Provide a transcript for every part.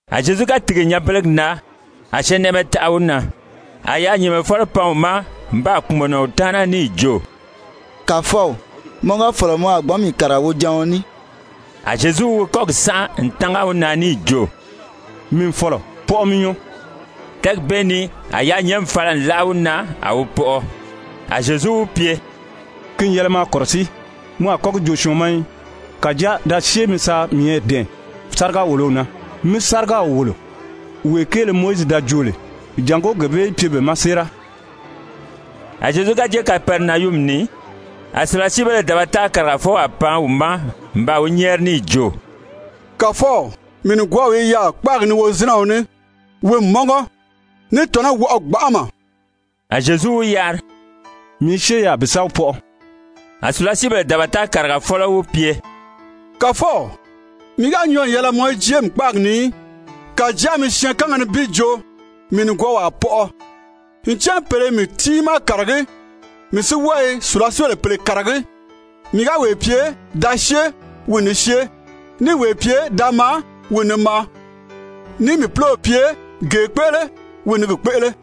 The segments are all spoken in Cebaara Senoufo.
A Zyezu ga tìgi nyanbelegi na a syɛɛnnɛʔɛmɛ taʔa wi na. A yaanyɛɛnmɛfɔlɔ pan wi ma n baa kpùmɔnɔ wi taana níì jo: «Kàfɔw, mɔ ga fɔ̀lɔ mɔ a gbǎn mii kàriga wojaɔn ní.» A Zyezu wi kɔ́gi sánʔa n tánga wi na níì jo: «Mii n fɔ̀lɔ, pɔʔɔ mi nyɔɔ.» Tɛ́ɛgi bee ni a yaanyɛɛnmi fala n láʔa wi na a wi pɔʔɔ. A Zyezu wi pye: «Ki n yɛlɛ maa kɔ̀rɔsíi, mɔ a kɔ́ gi joo syɔɔn ma í. Kàjáa da syée mi sa miyɛɛ dɛ̀ɛn sáriga-wòlow na, mí sárigaw wòlo, wee kéele Mowizi da joo lè, jàngó gee bee í pye be ma séera.» A Zyezu ga jée Kapɛrinayumi ni, a sùlasiibéle dabata kàrigafɔwaa pan wi ma n baa wi nyɛ́ɛri níì jo: «Kàfɔw, mii nìgwɔɔw i yaà kpáagi ni wozinɛɔ ní, wi n mɔ́ngɔ, ní tɔ̀nɔ́ i wɔʔɔ gbanʔama.» A Zyezu wi yari: «Mii i syée yaà bi sa wi pɔʔɔ.» A sùlasiibèle dabata kàrigafɔlɔ wi pye: «Kàfɔw, mii ga nyɔɔ n yɛlɛ mɔ í jée mii kpáagi ni í. Kàjáa mi syɛɛnkanga nibin joo, mii nìgwɔɔw a pɔʔɔ. Ncan pèle i mii tiimaa kàragí, mii si wɔ́ɔ i sùlasiibèle pèle kàragí. Mii ga wee pye: ‹Da syée,› wi n ni syée. Níì wee pye: ‹Da maa,› wi n ni maa. Níì mii púlow pye: ‹Gee kpéʔele,› wi n ni gi kpéʔele.»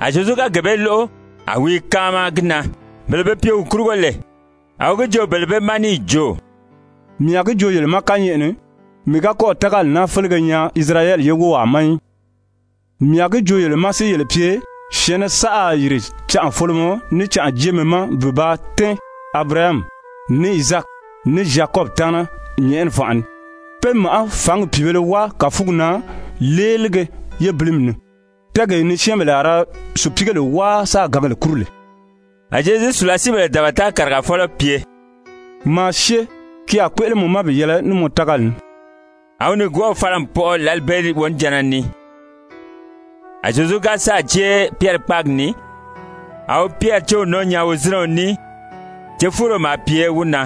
A Zyezu ga gee bee lóʔo, a wi i káama gi na. Bele be pye wi kurugo lè, a wi gi joo bele bee ma níì jo: «Mii a gi joo yele ma kányɛʔɛ ni, mii ga kɔ́ɔ̀ tágali naa félege nyaa Isirayɛli ye wówaa ma í. Mii a gi joo yele ma si yele pye, syɛ̀ɛnnɛ saʔa a yìri canʔafolomɔ ní canʔajeemɛ ma bi ba tɛ́ɛn Abirahami, ní Izaaki, ní Zyakɔbi taana nyɛ̀ʔɛni fànʔa ni, pé màʔá fǎngi pìibēle wáa kàfugi na léelige yébilimi ni, tɛ́ɛgee ni syɛ́ɛnbèle a ra sùpiigèle wáa sáā gǎngèle kúru lè.» A Zyezu sùlasiibèle dabata kàrigafɔlɔ pye: «Maa syée, ki a kpéʔele mɔ ma bi yɛlɛ ní mɔ tágali ní.» A wi nìgwɔɔw fala n pɔʔɔ lǎli bee wonijanna ni. A Zyezu ga sáà jée Pyɛri kpáagi ni, a wi Pyɛri céw nɔ́ɔ nyaa wozinɛɔ ní, cefuuro maa pye wi na.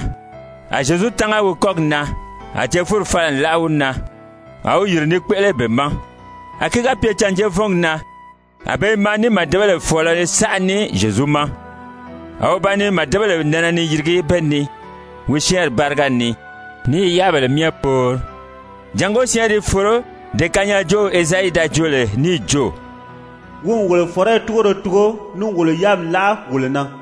A Zyezu tánga wi kɔ́gi na, a cefuuri fala n láʔa wi na. A wi yìri ni kpéʔele be ma. A ki ga pye cânjeevɔngi na a be i maa ní màdebèle fɔ̀ɔlɔ saʔa ní Zyezu ma. A wi ba ni màdebèle nɛnɛ ni yirigi be ni wi syɛ́ɛnri báriga ni ní i yáabèle myɛ poori, jàngó syɛ́ɛnri í foro, dee kanyaajoow Ezayi da joo lè níì jo: «Wi n wolo fɔ̀rɔyi túgoro tugo níì wolo yáami láʔa wolo na.»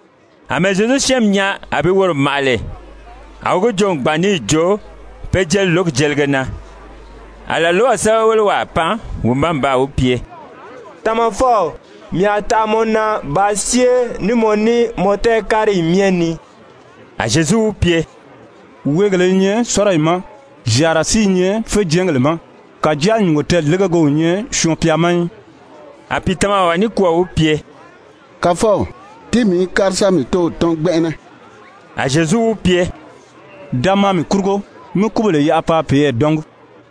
Amɛɛ Zyezu syɛ́ɛnmi nyaa a bi woro màʔa lè, a wi gi joo n gbàn níì jo pe jeli lǒgi jelige na. A làlwaw sɛ́bɛwelewaa pan wi ma n baa wi pye: «Tamafɔw, mii a taʔa mɔ na bàā syée ní mɔ ní mɔ tɛɛ̀káriyi myɛ ni.» A Zyezu wi pye: «Weegèlē i nyɛ sɔ́riyi ma, zyàara si i nyɛ féjɛɛngèle ma, kàjáa nyùngo tɛɛ̀légege o nyɛ Syɔɔn-pya ma í.» A pìitamawaa nikwɔɔ wi pye: «Kàfɔw, tíi mii í kári sa mii tóow tɔ́n gbɛnʔɛnɛ.» A Zyezu wi pye: «Da maa mii kurugo, mí kúbèle yaʔa paa peyɛɛ dɔ́ngi.»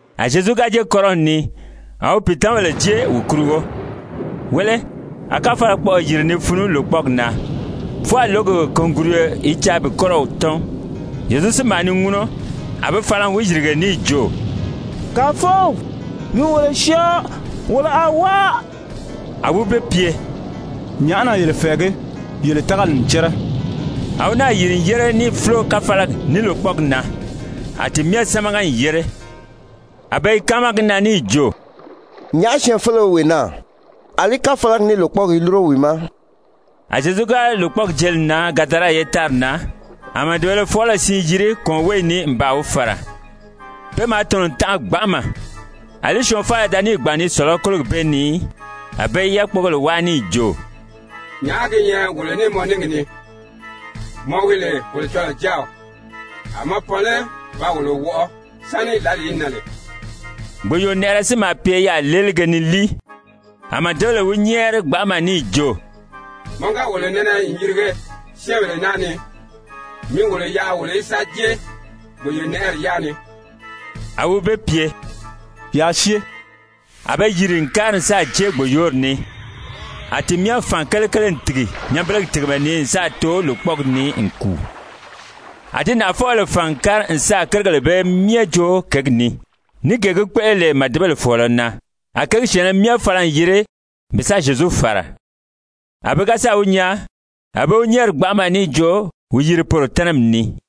A Zyezu ga jée kɔ́rɔw ni, a wi pìitamabèle jée wi kurugo. Wéle, a káfalakpɔʔɔ yìri ni funu lòkpɔɔgi na, fwɔɔ a lǒgi kùnguruyo i caa bi kɔ́rɔw tɔ́n. Zyezu si maa ni ŋúnɔ. A be fala n wi yìrige níì jo: «Kàfɔw, mi wolo syɔɔ. Wolo a wáa.» A wi be pye: «Nyàʔá na yele fɛ̀ɛgí? Yele tágali n cɛ́rɛ.» A wi náà yìri n yére níì fúlo káfalagi ní lòkpɔɔgi na. A ti myɛ sámaga n yére. A be i káama gi na níì jo: «Nyàʔá syɛɛnfeleo wi wee naa, àlí káfalagi ní lòkpɔɔgi i lúro wi ma?» A Zyezu ga lòkpɔɔgi jeli n nan Gadara ye tári na, a màdebēle fɔɔlɔ siin yiri kɔ̀ɔnweeyi ni n baa wi fàra. Pe maa tɔ̀nɔ n tanʔa gbanʔama. Alí syɔɔn faala da níì gbàn ni sɔ̀lɔ́ kólogi bee ni í. A be i yákpogèle wáa níì jo: «Nyàʔá gi nyɛ wolo ní mɔ níngi ni, mɔ wi lè Kolocɔlɔɔ Jáaw? A mɔ pan lé ba wolo wɔʔɔ sáni lǎli í nan lè?» Gbòyoonɛʔɛrɛ si maa pye yaà léelige ni líi. A màdebèle wi nyɛ́ɛri gbanʔama níì jo: «Mɔ ga wolo nɛnɛ n yirige syɛ́ɛnbèle naa ni, mi wolo yaʔa wolo í sa jée gbòyoonɛʔɛri yaa ni.» A wi be pye: «Yaa syée.» A be yiri n kári n sáà jée gbòyoori ni, a ti myɛ fàn kelekele n tìgi nyanbelegi tìgimɛ ni n sáà too lòkpɔɔgi ni n kùu. A di nàʔafɔbèle fàn n kári n sáà kérigèle bee myɛ joo kěgi ni, ní gee gi kpéʔele lè màdebèle fɔ̀ɔlɔ na. A kěgi syɛ̀ɛnnɛ myɛ fala n yiri bi sa Zyezu fàra. A be ga sáà wi nyaa, a be wi nyɛ́ɛri gbanʔama níì jo wi yiri poro tɛ́nɛmi ni.